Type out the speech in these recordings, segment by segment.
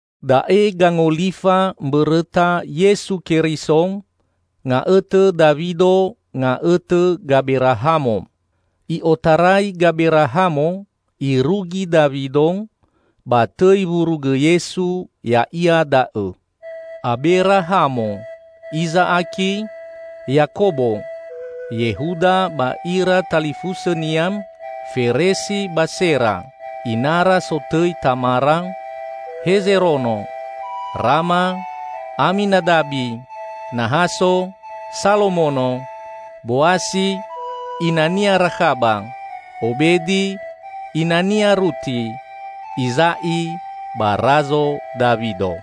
Da'e gangolifa mbõrõta Yesu Keriso, nga'õtõ Dawido, nga'õtõ Gaberahamo. I'otarai Gaberahamo irugi Dawido, ba tõi wurugõ Yesu ya'ia da'õ: Aberahamo, Iza'aki, Yakobo, Yehuda ba ira talifusõnia, Feresi ba Sera (inara sotõi Tamara), Hezerono, Rama, Aminadabi, Nahaso, Salomono, Boasi (inania Rakhaba), Obedi (inania Ruti), Iza'i, ba Razo Dawido.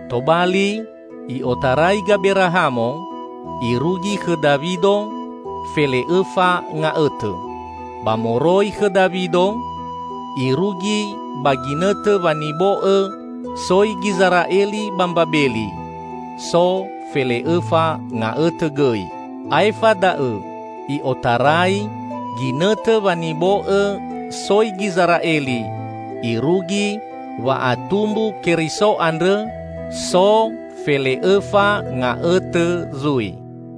Tobali i'otarai Gaberahamo irugi khõ Dawido fele'õfa nga'õtõ. Ba moroi khõ Dawido irugi ba ginõtõ wanibo'õ soi Gizera'eli ba Mbabeli so fele'õfa nga'õtõ gõi. Aefa da'õ i'otarai ginõtõ wanibo'õ soi Gizera'eli irugi wa'atumbu Keriso andrõ, so fele'õfa nga'õtõ zui.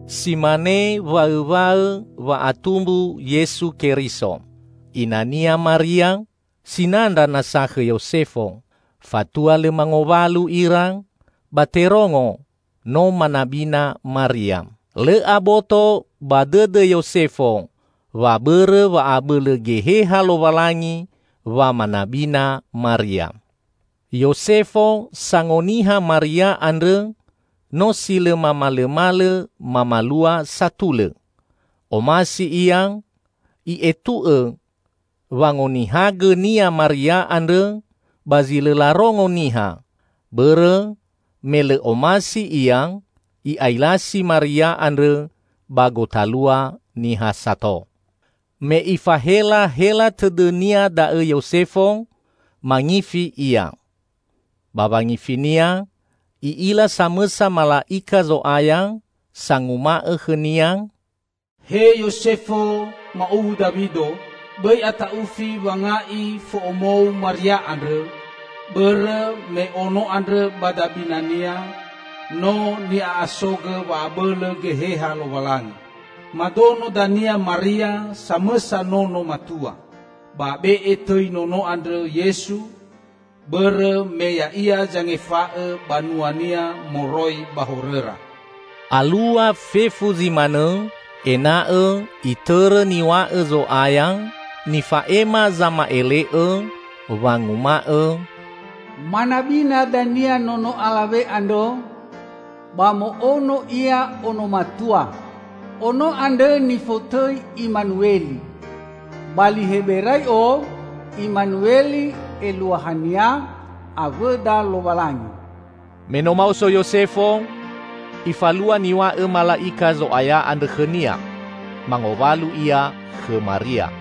Si mane waõwaõ wa'atumbu Yesu Keriso. Ina-Nia Maria, sinandra nasa khõ Yosefo. Fatua lõ mangowalu ira, ba terongo no manabina Maria. (Lõ aboto ba dõdõ Yosefo wa bõrõ wa'abõlõ Geheha Lowalangi wa manabina Maria.) Yosefo sangoniha Maria andrõ, no si lõ mamalõmalõ mamalua satulõ. Omasi ia i'etu'õ wangonihagõnia Maria andrõ ba zi lõ larongo niha, bõrõ me lõ omasi ia i'ailasi Maria andrõ ba gotalua niha sato. Me ifahelahela tõdõnia da'õ Yosefo, mangifi ia. Ba wangifinia i'ila samõsa mala'ika Zo'aya sanguma'õ khõnia, "He Yosefo, ma'uwu Dawido, bõi ata'ufi wanga'i fo'omou Maria andrõ, bõrõ me ono andrõ ba dabinania no ni'a'asogõ wa'abõlõ Geheha Lowalangi. Madono dania Maria samõsa nono matua. Ba be'e tõi nono andrõ Yesu, bõrõ me Ya'ia zangefa'õ banua-Nia moroi ba horõra." Alua fefu zi manõ ena'õ itõrõ niw̃a'õ Zo'aya nifa'ema zama'ele'õ, wanguma'õ, "Manabina dania nono alawe andrõ ba mo'ono ia ono matua. Ono andrõ nifotõi Imanueli." (Ba li Heberai'o Imanueli eluahania "Awõda Lowalangi".) Me no maoso Yosefo, ifalua niw̃a'õ mala'ika Zo'aya andrõ khõnia. Mangowalu ia khõ Maria.